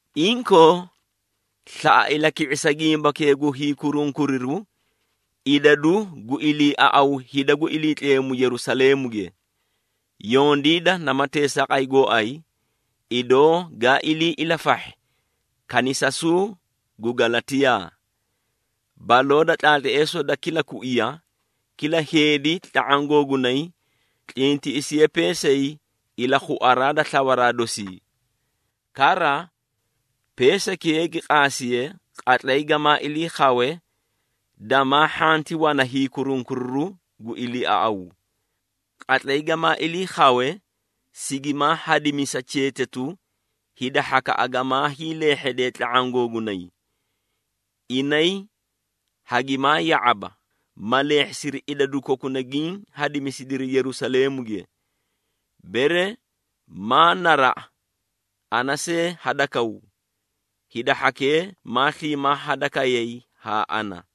Inkoo, slaꞌa ilaki⁄isa gimbakee gu hiikurunkuriru idadu gu iliiaꞌaw hida gu Iliitleemu Yerusaleemuge. Yondiida nama teesaaqay gooay, idoo gaa ilii ilafahhi kanisasuu gu Galatiyaa. Baloo da tlaatleesoo da kila kuiya, kila heedi tla⁄aã googunay tlintiꞌisiye peesay ilakhuaraa da slawaraa dosii. Kara, peesaykee gi qaasiye, qatlay gamaa ilii khawe, damaa hhanti wana hiikurunkuriru gu iliiaꞌaw. Qatlay gamaa ilii khawe, sigimaa hadimisa cheetatu hida hhakaꞌa gamaa hiileehhedee tla⁄aã googunay. Inay hagimaa ya⁄aba, ma leehhisiri idadu kokuna giĩ hadisidiri Yerusaleemuge. Bere maa naraꞌa ana see hadakaw, hida hhakee maa sliimaa hadakayay haa ana.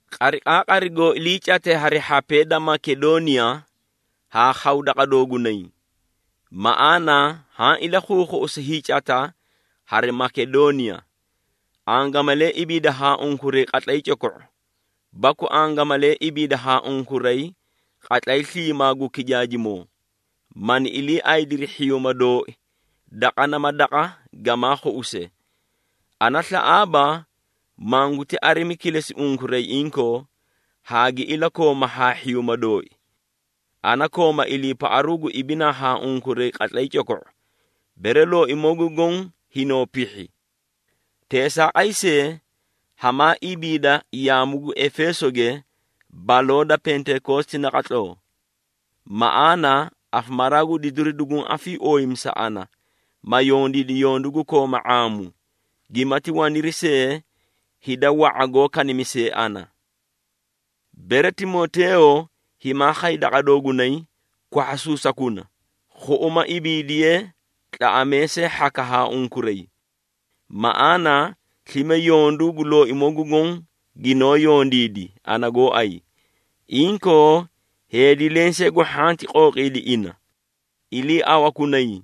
Qariqaaqari goo iliicate hari hhapee da Makedooniya, haa khaw daqa doogunay. Maꞌaana haã ilakhuukhuꞌusi hiicata hari Makedooniya. Angamalee ibiida haa unkuray qatlay coko⁄u, baku angamalee ibiida haa unkuray qatlay sliimaa gu kijaajimoo, mani iliiaydiri hhiyuuma dooi daqa nama daqa gamaa khuꞌuse. Ana slaꞌaaba, manguti arimi kilesi unkuray inkoo, haa gi ilakooma haa hhiyuuma dooi. Ana kooma iliipaꞌaru gu ibinaa haa unkuray qatlay coko⁄o, bere Looimoo gu Goõ hinoo pihhi. Teesaaqay see, hamaa ibiida yaamu gu Efeesoge baloo da Pentekoositi naqatloo. Maꞌaana afamaraa gu didiru duguũ afiiooyimi sa ana, ma yondiidi yondu gu kooma ⁄aamu, gimati waniri see hida wa⁄a goó kanimisee ana. Bere Timoteeyo himaa khay daqa doogunay, kwahhasuusakuna, khuꞌuma ibiidiye tlaꞌamee see hhaka haa unkuray. Maꞌaana slime yondu gu Looimoo gu Goõ ginoó yondiidi, ana gooay. Inkoo, heedi lensee gu hhanti qooqiidi ina. Iliiawakunay,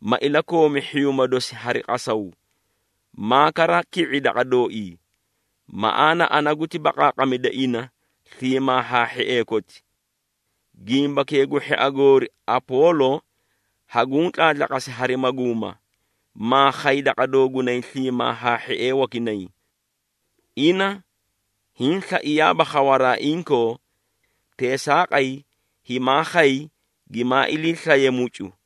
ma ilakoomi hhiyuuma dosi hari qasaw, maa kara ki⁄i daqa dooii. Maꞌaana ana guti baqaaqamida ina sliimaa haa hhiee koti. Gimbakee gu hhia goori Apoolo, haguũ tlaatlaqasi hari maguuma, maa khay daqa doogunay sliimaa haa hhiee wakinay. Ina hiĩ slaiyaaba khawaraa inkoo, teesaaqay himaa khay gimaa iliislaye mucu.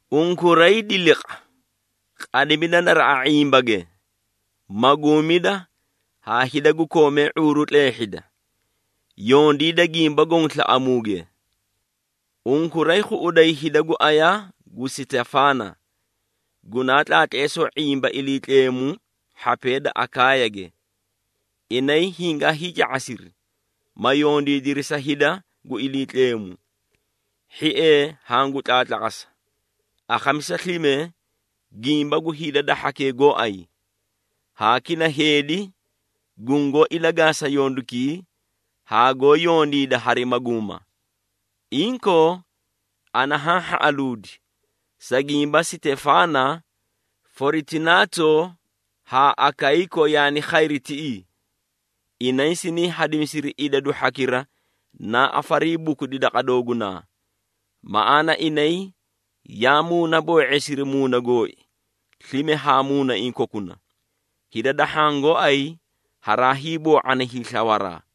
Unkuray diliqa, qadimida naraꞌa ⁄imbage, maguumida haa hida gu koomee ⁄uuru tleehhida. Yondiida gimba goõ slaꞌamuuge. Unkuray khuꞌuday hida gu aya gu Sitefaana gunaa tlaatleesoo ⁄imba Iliitleemu hhapee da Akaayage. Inay hingaa hiica⁄asiri, ma yondiidiri sa hida gu Iliitleemu. Hhiee hangu tlaatlaqasa, akhamisa slime gimba gu hida da hhakee gooay, haa kila heedi gungoó ilagaasa yondukii, haa goó yondiida hari maguuma. Inkoo, ana haã hhaꞌaluudi, sa gimba Sitefaana, Foritunaato haa Akayiiko yaani khayri tiꞌii. Inay siniĩ hadimisiri idadu hhakira naa afariibukudi daqa doogunaa. Maꞌaana inay yaa muunaboo⁄eesiri muuna gooi slime haa muunaiĩ kokuna. Hida da hhaã gooay haraa hiiboo⁄ani hiislawaraa.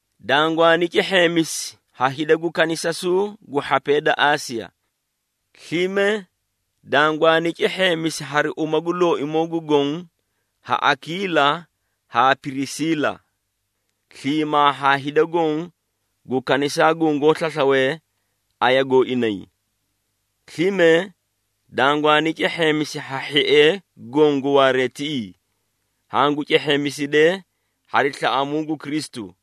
Dangwaani cehheemisi ha hida gu kanisasuu gu hhapee da Aasiya. Slime dangwaani cehheemisi hari uma gu Looimoo gu Goõ ha Akiila haa Pirisiila, sliimaa haa hida goõ gu kanisaa gungoó slaslawe aya gooinay. Slime dangwaani cehheemisi ha hhiee goõ gu waaree tiꞌii. Hangu cehheemisidee hari slaꞌamuu gu Kristu.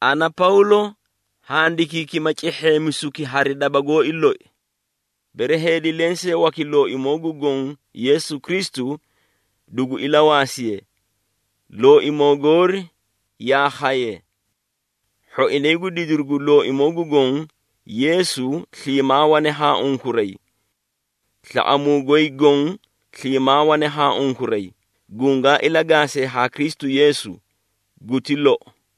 Ana, Pawlo, handikiikima cehheemisuki hari daba gooi loi. Bere heedi lensee waki Looimoo gu Goõ Yeesu Kristu, dugu ilawaasiye. Looimoo goori yaa khaye. Hhoinay gu didiru gu Looimoo gu Goõ Yeesu sliimaa wane haa unkuray. Slaꞌamuu goy goõ sliimaa wane haa unkuray gungaa ilagaasee haa Kristu Yeesu. Guti lou.